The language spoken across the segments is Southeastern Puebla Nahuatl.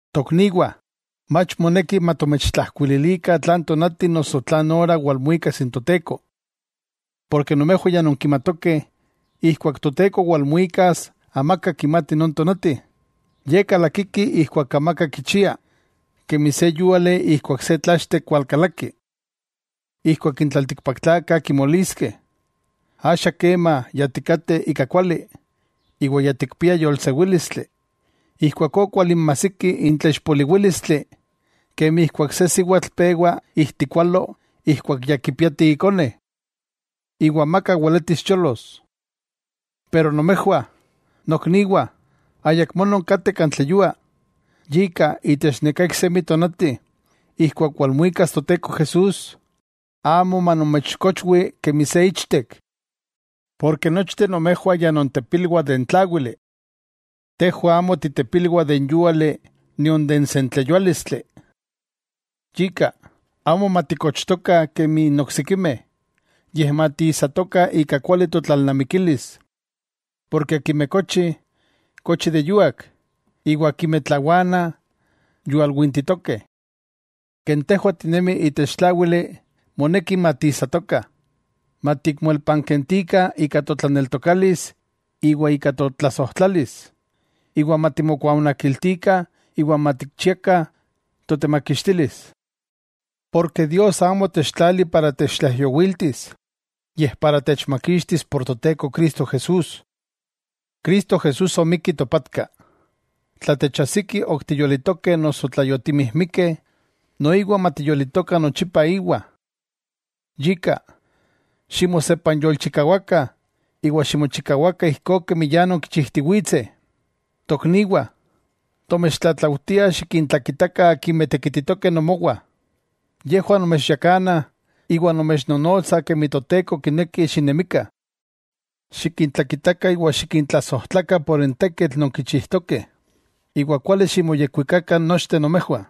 Tokniwah, mach moneki matomechijkuililikah tlan tonati noso tlan ora walmuikas n Toteko. Porke nomejwah ya nonkimatokeh ijkuak Toteko walmuikas amaka kimati non tonati, Ye kalakiki ijkuak amaka kichia, kemi se yuali ijkuak se tlachtek walkalaki. Ijkuak n tlaltikpaktlakah kimoliskeh: “Axa kema ya tikateh ika kuali, iwa ya tikpiah yolsewílistli”, ijkuakó kualinmajsiki n tlaixpoliwílistli, kemi ijkuak se siwatl pewa ijtikualo ijkuak ya kipiati ikone. Iwa amaka weletis cholos. Pero nomejwah, nokniwah, ayakmó nonkateh kan tleyua, yika itech neká iksemi tonati ijkuak walmuikas Toteko Jesús, amo manomechkochwi kemi se ichtek. Porke nochteh nomejwah ya nontepilwah de n tláwili. Tejwah amo titepilwah de n yúali nion de n sentleyuálistli. Yika, amo matikochtokah kemi n oksikimeh, yej matiijsatokah ika kuali totlalnamikilis. Porke akimeh kochi, kochi de yuak, iwa akimeh tlawanah, yual wintitokeh. Ken tejwah tinemih itech tláwili, moneki matiisatokah. Matikmoelpankentikah ika totlaneltokalis iwa ika totlasojtlalis, iwa matimokuaonakiltikah iwa matikchiakah totemakixtilis. Porke Dios amo otechtlali para techtlaijyowiltis, yej para techmakixtis por Toteko Cristo Jesús. Cristo Jesús omikki topatka, tla techajsiki ok tiyolitokeh noso tla yotimijmikeh, noiwa matiyolitokah nochipa íwa. Yika, ximosepanyolchikawakah iwa ximochikawakah ijkó kemi ya nonkichijtiwitseh. Tokniwah, tomechtlatlaujtiah xikintlakitakah akimeh tekititokeh nomowah. Yejwah nomechyakanah iwa nomechnonotsah kemi Toteko kineki xinemikah. Xikintlakitakah iwa xikintlasojtlakah por n tekitl non kichijtokeh. Iwa kuali ximoyekwikakah nochteh nomejwah.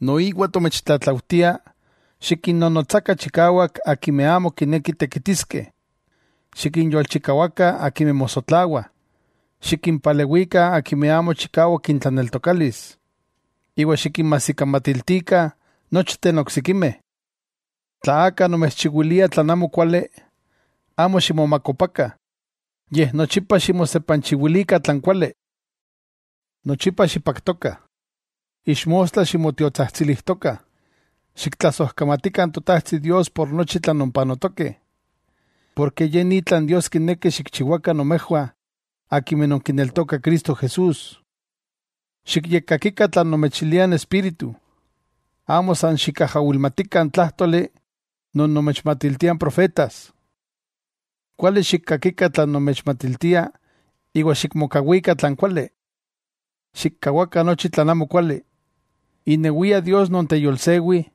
Noiwa tomechtlatlaujtiah xikinnonotsakah chikawak akimeh amo kinekih tekitiskeh. Xikinyolchikawakah akimeh mosotlawah. Xikimpalewikah akimeh amo chikawak intlaneltokalis, iwa xikinmajsikamatiltikah nochteh n oksikimeh. Tla aka nomechchiwilia tlan amokuali, amo ximomakopakah. Yej nochipa ximosepanchiwilikah tlan kuali. Nochipa xipaktokah. Ixmostla ximotiotsajtsilijtokah. Xiktlasojkamatikah n Totajtsi Dios por nochi tlan nonpanotokeh, porke ye ni tlan Dios kineki xikchiwakah nomejwah akimeh nonkineltokah Cristo Jesús. Xikyekkakikah tlan nomechiliah n Espíritu. Amo san xikajawilmatikah n tlajtóli non nomechmatiltiah n profetas. Kuali xikkakikah tlan nomechmatiltiah iwa xikmokawikah tlan kuali. Xikkawakah nochi tlan amokuali. Inewia Dios non teyolsewi,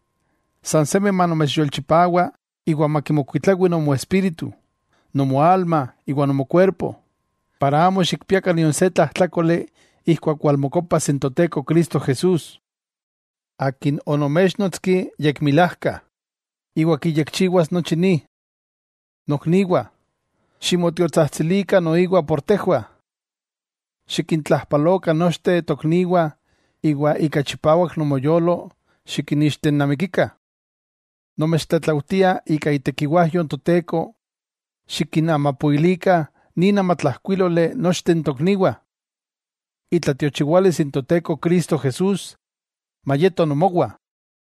sansemi manomechyolchipawa iwa makimokuitlawi nomoespíritu, nomoalma iwa nomokuerpo, para amo xikpiakah nion se tlajtlákoli ijkuak walmokopas n Toteko Cristo Jesús. Akin onoméchnotski yekmilajka, iwa kiyekchiwas nochi ni. Nokniwah, ximotiotsajtsilikah por tejwah. Xikintlajpalokah nochteh tokniwah iwa ika chipawak nomoyolo xikinixtenamikikah. Nomechtlatlaujtia ika itekiwajyo n Toteko, xikinamapoilikah nin amatlajkuíloli nochteh n tokniwah. Itlatiochiwalis n Toteko Cristo Jesús mayeto nomowah.